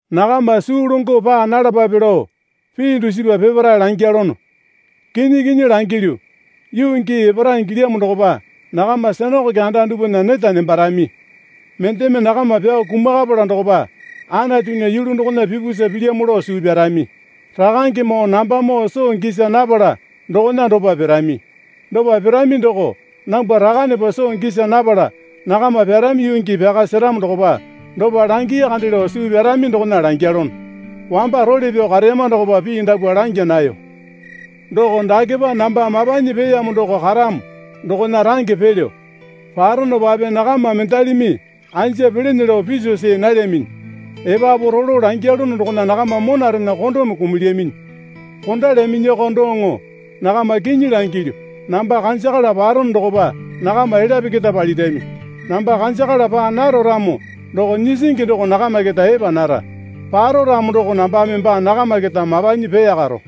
Nakama suu longo paa nalapape lao pii dusipa peparae langyalono. Kinyi kinyi langilyu, yuu gii epara ingilyamo dokopa nakama sinakoke anda dupwana neta nembarami. Mendeme nakama pyao kumakapala dokopa Anatunya yulu dokona pipusa pilyamo lao suu pyarami. Rakangemoo nambamoo soo gisa napala dokona dopa pirami. Dopa pirami doko nambwa Rakanepa soo gisa napala nakama pyarami yuu gii pyaka seramo dokopa dopa langii kande lao suu pyarami dokona langyalono. Wamba role pyao kareyama dokopa pii dapwa langya nayo. Doko dakepa namba mapanyi peeyamo doko karamo dokona range pelyo. Paronopape nakama mendalimi anja pelene lao piso see nalyaminyi. Epapu rolo langyalono dokona nakama monarena kondome kumulyaminyi. Kondalyaminyako doŋo nakama kinyi langilyu, namba kanjakala parono dokopa nakama elyape keta palirami. Namba kanjakala paa naro ramo doko Nyisingi doko nakama keta epa nara. Paro ramo doko nambame baa nakama keta mapanyi peeyakaro.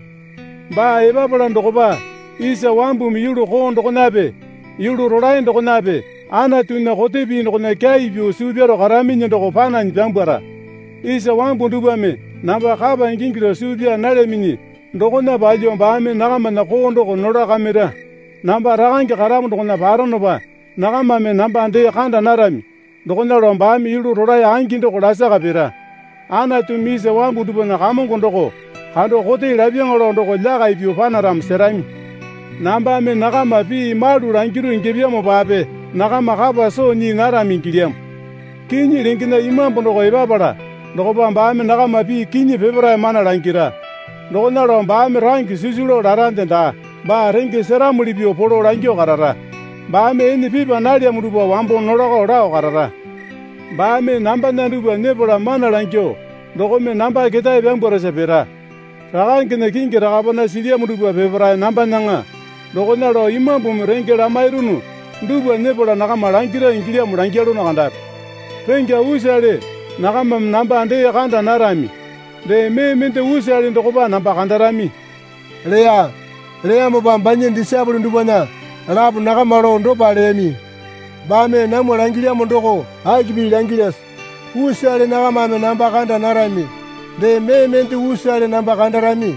Baa epapala dokopa isa wambumi yulu koo dokonape yulu rolae dokonape Anatunya kote pii dokona kyai pyuo suu pyaro karaminyi doko pananyi pyambwara. Isa wambu dupwame namba kapa ingingi lao suu pyaa nalyaminyi dokona palyuo baame nakamana koo doko nolakakamira. Namba Rakange karamo dokona paronopa nakamame namba dee kando narami dokona lao baame yulu rolae angi doko lasaka pira. Anatumi isa wambu dupwana Kamongo doko kando kote lapyaŋa lao doko lyakai pyuo panaramo serami. Nambame nakama pii malu langiru ingyapyamopape nakama kapa soo nyii narami ingilyamo. Kinyi lengena Imambu doko epapala dokopa baame nakama pii kinyi peparae mana langira. Dokona lao baame range sisu lao larande daa. Baa renge seramuli pyuo polo langyuo karara. Baame ene pipa nalyamo dupwa wambo nolakao lao karara. Baame nambana dupwa nyepala mana langyuo dokome namba keta pyambwarasa pira. Rakangena kingi rakapana silyamo dupwa peparae nambanaŋa. Dokona lao Imambumi renge lamairunu dupwa nyepala nakama langira ingilyamo langyalono kandapi. Rengya usale nakamame namba dee kanda narami. Dee mee mende usale dokopa namba kandarami, leya. Leyamopa banya disaepole dupwana lapo nakama lao dopa leyami. Baame namwa langilyamo doko aki pii langilyase? Usale nakamame namba kanda narami, dee mee mende usale namba kandarami.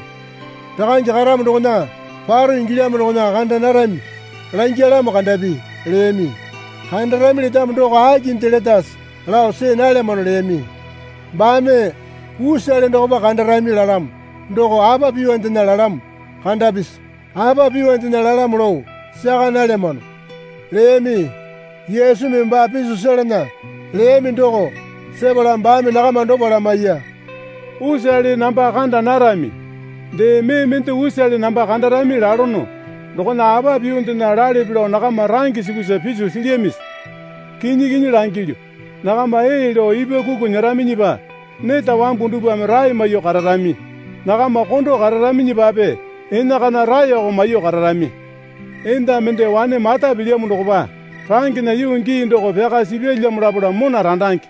Rakange karamo dokona paro ingilyamo dokona kanda narami langyalamo kandapi, leyami. Kandarami letamo doko akinde letase lao see nalyamano leyami. Baame, Usale dokopa kandarami lalamo doko apa pyuondena lalamo kandapisi? Apa pyuondena lalamo lao saka nalyamano, leyami. Yesumi baa piso selana leyami doko. Sepala baame nakama dopa lamaiya. Usale namba kanda narami, dee mee mende usale namba kandarami lalono dokona apa pyuondena lalepe lao nakama range sukusa piso silyamisi? Kinyi kinyi langilyu, nakama ee lao ipwakuku nyeraminyipa neta wambu dupwame rae maiyuo kararami. Nakama kondo kararaminyipape enakana raeko maiyuo kararami. Enda mende wane mata pilyamo dokopa rangena yuu gii doko pyaka sipyalyamo lapala mona randange.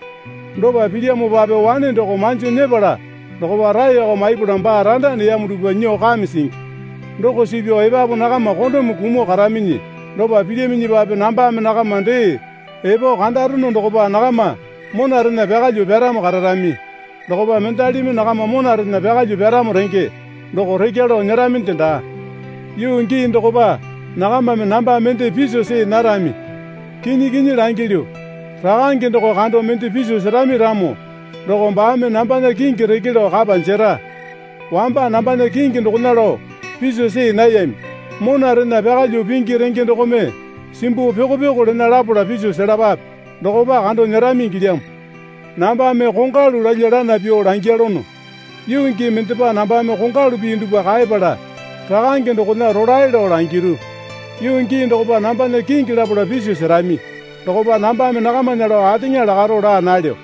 Dopa pilyamopape wane doko manjo nyepala dokopa raeko maipala baa randa neyamo dupwa nyuo kame singi. Doko suu pyao epapu nakama kondome kumuo karaminyi. Dopa pilyaminyipape nambame nakama dee epo kandarono dokopa nakama monarena pyakalyuo pyaramo kararami. Dokopa mendalimi nakama monarena pyakalyuo pyaramo renge doko rekya lao nyeraminde daa. Yuu gii dokopa nakamame namba mende piso see narami. Kinyi kinyi langilyu, Rakange doko kando mende piso serami ramo doko baame nambana kingi reke lao kapa jera. Wamba nambana kingi dokona lao piso see nayami. Monarena pyakalyuo pingi renge dokome simbuo pyoko pyoko lena lapala piso selapape. Dokopa kando nyerami ingilyamo. Nambame kongwalu lalya lana pyuo langyalono. Yuu gii mendepa nambame kongwalu pii dupwa kaepala Rakange dokona rolae lao langiru. Yuu gii dokopa nambana kingi lapala piso serami. Dokopa nambame nakamana lao ateŋa lakaro laa nalyo.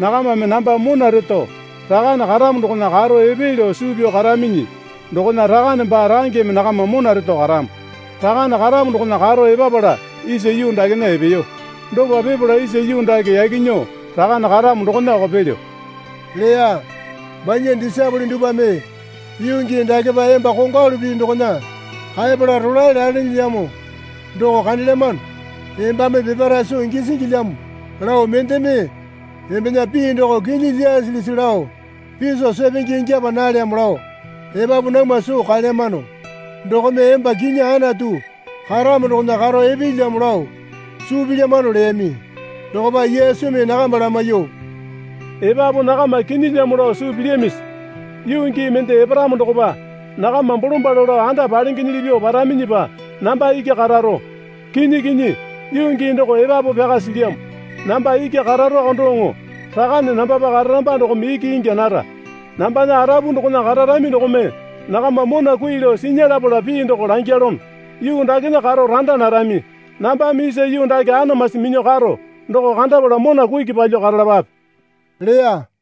Nakamame namba mona reto Rakane karamo dokona karo epee lao suu pyao karaminyi dokona Rakane baa rangeme nakama mona reto karamo. Rakane karamo dokona karo epapala isa yuu dakena epeyo. Dopa pipala isa yuu dake yaki nyuo Rakane karamo dokonako pelyo, leya. Banya disaepole dupwame, Yuu gii dakepa emba kongwalu pii dokona kaepala rolae lalenelyamo doko kandelyamano. Embame peparae soo gisingilyamo lao mendeme embena pii doko kinyi lyasilisi lao piso sepenge ingyapa nalyamo lao epapu namwa soo kaelyamano. Dokome emba kinyi Anatu karamo dokona karo epeelyamo lao suu pilyamano leyami. Dokopa Yesumi nakama lamaiyuo, Epapu nakama kinyilyamo lao suu pilyamisi? Yuu gii mende eparamo dokopa nakama bolombalo lao anda palengenyili pyuo paraminyipa namba iki kararo. Kinyi kinyi, yuu gii doko epapu pyaka silyamo. Namba iki kararoko doŋo Rakane nambapa kararamba dokome iki ingya nara. Nambana arapu dokona kararami dokome nakama mona kui lao sinya lapala pii doko langyalono. Yuu dakena karo randa narami. Nambame isa yuu dake anamasi minyuo karo doko kandapala mona kuki palyuo karalapape, leya.